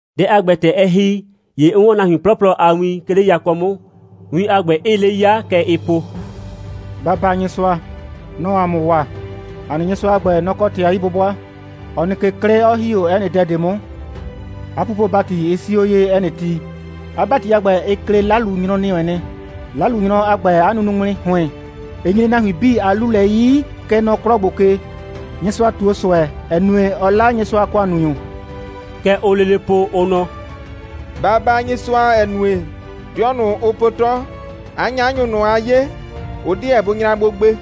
Dɛ a ‑gbɛ, ‑tɛ ɛ ‑hi, ‑ye 'n 'wɔn nahuin 'plɔplɔ a win, 'ke 'le yakɔ 'mʋ, win a ‑gbɛ 'ɩɩ 'le 'yaa. Kɛ ɩɩ po: «Ba baa Nyɩsʋa. Nɔ‑ɔ ‑a mʋ waa. ‑A nɩ Nyɩsʋa a ‑gbɛ, nɔ‑ kɔ ‑tɩ a 'yi'bʋbʋa, 'ɔ nɩ 'klɩ ke, 'ɔ ‑hi 'o 'ɛ nɩ dɛ ꞊de 'mʋ. 'A pupo‑bati, ɩ 'sii 'o ye, 'ɛ nɩ ti. 'A ‑bati a ‑gbɛ, ɩ klɩ 'lalunyrɔ ‑nɩ wɛn nɩ. 'Lalunyrɔ a ‑gbɛ a nunuŋmli ‑hʋɩn, ɩ nyre nahuin 'bii a 'lu lɛ 'yi, kɛ nɔ 'klɔ ‑gbo ke. Nyɩsʋa ꞊tuo ꞊sʋɛ, ‑ɛ nue, ɔ 'la Nyɩsʋa a ‑kʋannunyʋ.» Kɛ ʋʋ lele po, ʋ nɔ: «Ba baa Nyɩsʋa, ‑ɛ nue, 'dɩɔ ꞊nʋ, ʋ po 'tɔ, 'a 'nyanyʋ ꞊nʋ, aa 'ye, ʋ 'deɛ bʋ nyra gbo gbe.»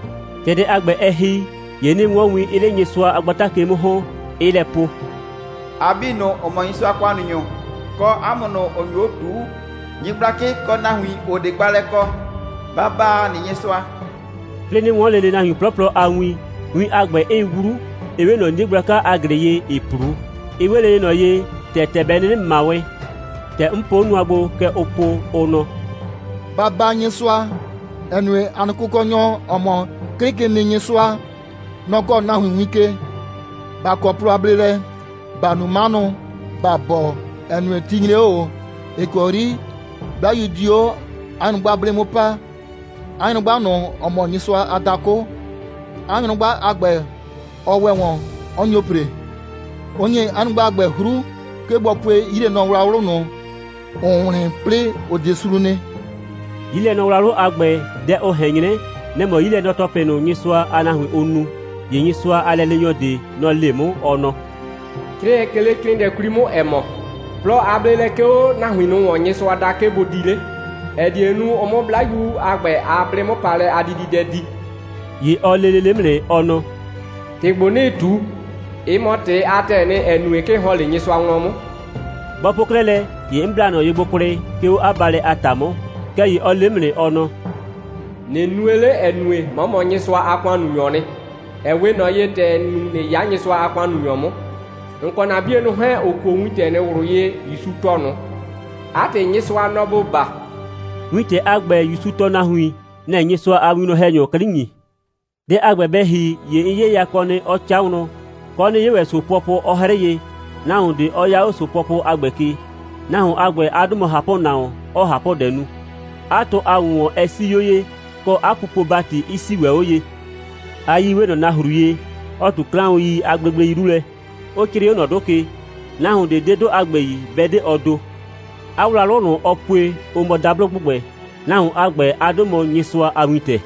‑Tɛ dɛ a ‑gbɛ, ɛ ‑hi, ‑ye 'nɩɩ 'wɔn win, 'ɩɩ 'le Nyɩsʋa a gbata ke 'mʋ ‑hɔn, 'ɩɩ lɛ po: «A 'bii ꞊nʋ, ‑ʋ mɔ Nyɩsʋa a ‑kʋannunyʋ, kɔ 'a mʋ ꞊nʋ, ‑ʋ nyo 'o ꞊tuu, nyɩgblakɩ, kɔ nahuin, ‑ʋ 'de gbaalɛ kɔ, ba baa ‑a nɩ Nyɩsʋa,» 'plɩɩ 'nɩ 'wɔn lele nahuin 'plɔplɔ a win, win a ‑gbɛ 'ɩɩ 'wlu, 'ɩ 'we ꞊nɔ 'nie gblaka a ‑glɩ ye, ‑ɩɩ 'plu, 'ɩ 'we lele ꞊nɔ ye, ‑tɛ ‑tɛ bɛ 'nɩnɩ ꞊ma wɛn. ‑Tɛ 'n po 'o nʋa gbo, kɛ ʋʋ po, ʋ nɔ: «Ba baa Nyɩsʋa, ‑ɛ nue, ‑a nɩ Kʋkɔnyɔ, ‑ɔ mɔ 'Klɩkenɩnyɩsʋa, nɔ‑ kɔɔ nahuin win ke. ‑Ba kɔ plɔ a bleelɛ, ‑ba nu 'manʋ, ‑ba bɔɔ, ‑ɛ nue, ti nyre 'o ꞊o, ‑ɩ kɔ 'yri 'Blayu di 'o 'a nyrʋgba 'blɩ 'mʋ paa ('a nyrʋgba ꞊nʋ, ‑ɔ mɔ Nyɩsʋa a dakʋ). 'A nyrʋgba a ‑gbɛ, ɔ ‑wɛ ‑wɔn, 'ɔ nyo ‑pre. Ʋ ‑nyi 'a nyrʋgba a ‑gbɛ 'hru, 'ke bɔ pue 'yilɛnɔwlawlʋ ꞊nʋ, ‑ʋʋ wlɩn, 'plɩɩ ‑ʋ 'de sru nɩ.» 'Yilɛnɔwlawlʋ a ‑gbɛ, dɛ ʋ ꞊hɛn 'nyrɛ, nɛ‑ mɔ 'yilɛnɔ‑tɔplɩ ꞊nʋ, Nyɩsʋa a nahuin, ʋ nu. ‑Ye Nyɩsʋa a lɛleenyɔ ꞊de, nɔ‑ le 'mʋ, ɔ nɔ: «'Crɩɛ, 'ke 'le 'crɩɩnɩɛ 'kwli 'mʋ, ‑ɛ mɔ: Plɔ a bleelɛ 'ke 'o nahuin ꞊nʋ ‑wɔn, Nyɩsʋa da, 'ke bʋ di 'le, ‑ɛ die nu, ʋ 'mʋ 'Blayu a ‑gbɛ a 'blɩ'mʋpaalɛ a dididɛ di.» ‑Ye ɔ le lele 'mʋ nɩ, ɔ nɔ: «‑Tɩ ‑gbo, 'nɩɩ ꞊tu, ɩ mɔ ‑tɩ a ‑tɛɛ nɩ, ‑ɛ nue, 'ke ɩ ‑hɔn 'le Nyɩsʋa wlɔn 'mʋ.» Bɔ po 'klɛɛ lɛ, ‑ye 'n bla ꞊nɔ ye gbo kwlɩ, 'ke 'o 'a baalɛ a ‑ta 'mʋ. Kɛɛ ‑ye ɔ le 'mʋ nɩ, ɔ nɔ: «꞊Nɩ nue 'le, ‑ɛ nue, 'mɔ mɔ Nyɩsʋa a ‑kʋannunyɔɔ nɩ, ‑ɛ 'we ꞊nɔ ye, ‑tɛ ‑n nu, ꞊nɩ 'ya Nyɩsʋa a ‑kʋannunyɔ 'mʋ, ‑n kɔ ‑na 'bienʋ ꞊nʋ 'hɛɛn, ‑ʋ kuo wintɛ ꞊nʋ ꞊wlʋ ye, ‑Yusu tɔɔ ꞊nʋ. 'A ‑tɩ, Nyɩsʋa, nɔ‑ ‑bo baa.» Wintɛ a ‑gbɛ, ‑Yusu tɔɔ nahuin, nɛ‑ɛ Nyɩsʋa a winwlɔn‑hɛnyʋ 'klɩ ‑nyi. Dɛ a ‑gbɛ bɛ ‑hi, ‑ye 'n 'ye yakɔ nɩ, 'ɔ 'ca wlɔn, kɔ, 'nɩ 'ye ‑wɛ ‑so pʋɔpʋ, 'ɔ 'hrɩɩ ye, nahuon ꞊de, 'ɔ 'ya 'o ‑so pʋɔpʋ a ‑gbɛ ke. Nahuon a ‑gbɛ, 'a 'dʋ mɔ ꞊Hapʋnahuon, ‑ɔɔ ꞊hapʋdɛ nu. 'A tʋ a ‑wʋnwɔn ɛ 'sii 'o ye, kɔ, 'a pupo‑bati 'ɩ 'sii ‑wɛ 'o ye. 'A 'yii 'we ꞊nɔ nahru ye, 'ɔ ꞊tu 'klaʋn.i a gblegblei 'lu lɛ, 'ʋ 'crɩɩ 'o ꞊nɔ 'dʋ ke. Nahuon ꞊de 'de 'dʋ a ‑gbɛ yi, 'bɛ 'de ɔ ‑do. 'A wlawlʋ ꞊nʋ, ɔ pue, ʋ mɔ dablo ‑gbʋgbɛ. Nahuon a ‑gbɛ, 'a 'dʋ mɔ «Nyɩsʋa a Wintɛ.»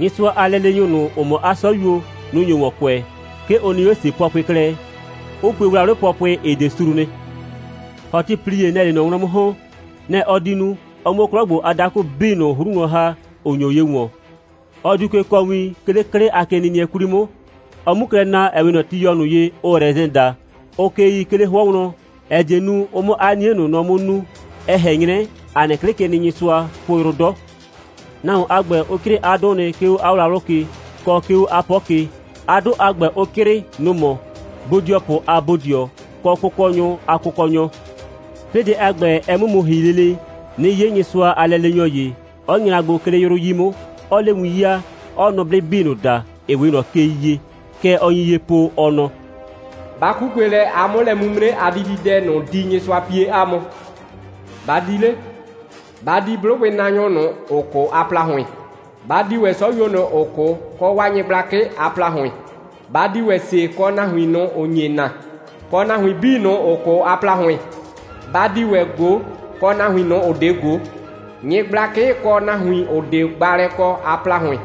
Nyɩsʋa a lɛleenyʋ ꞊nʋ, ‑ʋ mɔ 'a 'sɔyuo, nʋ‑ nyo ‑wɔn kʋɛ. 'Ke ʋ nɩ 'o ‑se pʋɔpʋɩ klɛ, 'ʋ pue wlawlɩ pʋɔpʋɩ, ‑ɩ 'de sru nɩ. ‑Hɔtɩplie, nɛ‑ɛ 'le ꞊nɔ wlɔn 'mʋ ‑hɔn. Nɛ‑ ɔ di nu, ɔ 'mʋ 'o 'klɔ ‑gbo a dakʋ 'bii ꞊nʋ 'hru wlɔn ‑ha, ‑ʋ nyo ye ‑wɔn. Ɔ diu ke kɔɔ win, 'ke 'le 'klɩ a kenɩnɩɛ 'kwli 'mʋ, ɔ 'mu klɛ na, ‑ɛ 'we ꞊nɔ tiyɔ ꞊nʋ ye, ʋʋ rɛsɛn daa, ʋʋ ke yii, 'ke 'le 'hʋɔ wlɔn, ‑ɛ die nu, ʋ 'mʋ 'a 'nie ꞊nʋ nɔ 'mʋ nuu. Ɛ ꞊hɛn 'nyrɛ, ‑a nɩ 'Klɩkenɩnyɩsʋaa po yrʋ 'dɔ. Nahuon a ‑gbɛ, ʋ 'crɩɩ 'a 'dʋ nɩ, 'ke 'o 'a wlawlʋ ke, kɔ, 'ke 'o 'a 'pɔ ke. 'A 'dʋ a ‑gbɛ, ʋ 'crɩɩ, nʋ‑ mɔ: Bodɩɔpʋ a Bodɩɔ, kɔ kʋkɔnyʋ a Kʋkɔnyɔ. 'Plɩɩ dɛ a ‑gbɛ, ɛ 'mʋ mu ‑hi lele, 'nɩ 'ye Nyɩsʋa a lɛleenyɔ ‑ye, 'ɔ nyra gbo, 'ke 'le 'yrʋ 'yi 'mʋ, 'ɔɔ 'le win 'yaa, 'ɔɔ nʋblɩ 'bii ꞊nʋ da, ‑ɩ 'we ꞊nɔ kei ye. Kɛ ɔ nyi ye po, ɔ nɔ: «Ba 'kukue lɛ, a 'mʋ lɛ'mimre a dididɛ ꞊nʋ di, Nyɩsʋa pie 'a mʋ. Ba di 'le, ba di 'blʋgbɩnaanyʋ ꞊nʋ, ‑ʋ 'kʋ a ‑plahʋɩn. Ba di ‑wɛ 'sɔyuo ꞊nʋ, ‑ʋ 'kʋ, kɔ 'waa nyɩgblakɩ a ‑plahʋɩn. Ba di ‑wɛ ‑se kɔ nahuin ꞊nʋ, ‑ʋ nye naa, kɔ nahuin 'bii ꞊nʋ, ‑ʋ 'kʋ a ‑plahʋɩn. Ba di ‑wɛ ꞊go, kɔ nahuin ꞊nʋ, ‑ʋ 'de ꞊go, nyɩgblakɩ, kɔ nahuin, ‑ʋ 'de gbaalɛ kɔ a ‑plahʋɩn.»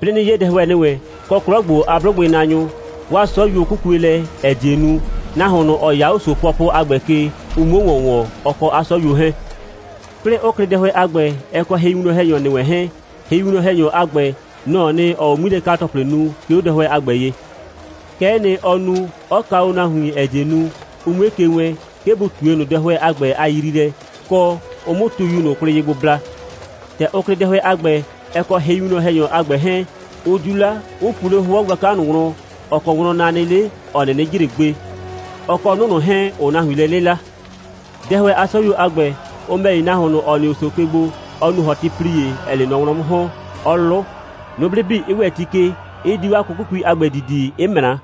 'Plɩɩ 'nɩ 'ye dɛhʋɛ ‑nɩ wɛn, kɔ 'klɔ ‑gbo a 'blʋgbɩnaanyʋ. 'Waa 'sɔyuo 'kukue lɛ, ‑ɛ die nu, nahuon ꞊nʋ, ‑ɔ 'ya ‑so pʋɔpʋ a ‑gbɛ ke, ʋ 'muo ‑wɔn ‑wɔn, ɔ kɔ 'a 'sɔyuo 'hɛɛn. 'Plɩɩ 'ʋ klɩ dɛhʋɛ a ‑gbɛ, ɛ kɔ hɩwinwlɔn‑hɛnyɔ ‑nɩ wɛn 'hɛɛn. Hɩwinwlɔn‑hɛnyɔ a ‑gbɛ, nɔ‑ɔ nɩ, ‑ɔɔ o 'ŋmilɛka‑tɔplɩ nu, 'ke 'o dɛhʋɛ a ‑gbɛ ye. Kɛ'ɛ nɩ, ɔ nu, 'ɔ kaa o nahuin, ‑ɛ die nu, ʋ 'mue ke wɛɛn, 'ke bʋ ꞊tue ꞊nʋ dɛhʋɛ a ‑gbɛ a yriilɛ, kɔ, ʋ 'mʋ tuyu ꞊nʋ kwlɩ ye gbo bla. ‑Tɛ ʋ klɩ dɛhʋɛ a ‑gbɛ, ɛ kɔ hɩwinwlɔn‑hɛnyɔ a ‑gbɛ 'hɛɛn, ʋ 'diu 'la, 'ʋ pu 'le 'hʋɔ gblaka ꞊nʋ wlɔn, ‑ɔ kɔ wlɔn na nɩ 'le, ‑ɔ 'nɩnɩ jre gbe, ɔ kɔ 'nʋ ꞊nʋ 'hɛɛn, ‑ʋʋ nahuin lɛ 'lɩla. Dɛhʋɛ a 'sɔyuo a ‑gbɛ, ʋ ‑mɛ ‑ye, nahuon ꞊nʋ, ‑ɔ nɩ 'o ‑so ke gbo, ɔ nu ‑hɔtɩplie, ‑ɛɛ 'le ꞊nɔ wlɔn 'mʋ ‑hɔn, 'ɔ 'lʋ, nʋblɩ 'bii 'ɩ ‑wɛ ti ke, 'ɩ di 'waa 'kʋkʋkui a ‑gbɛ ‑didi, 'ɩ ꞊mra.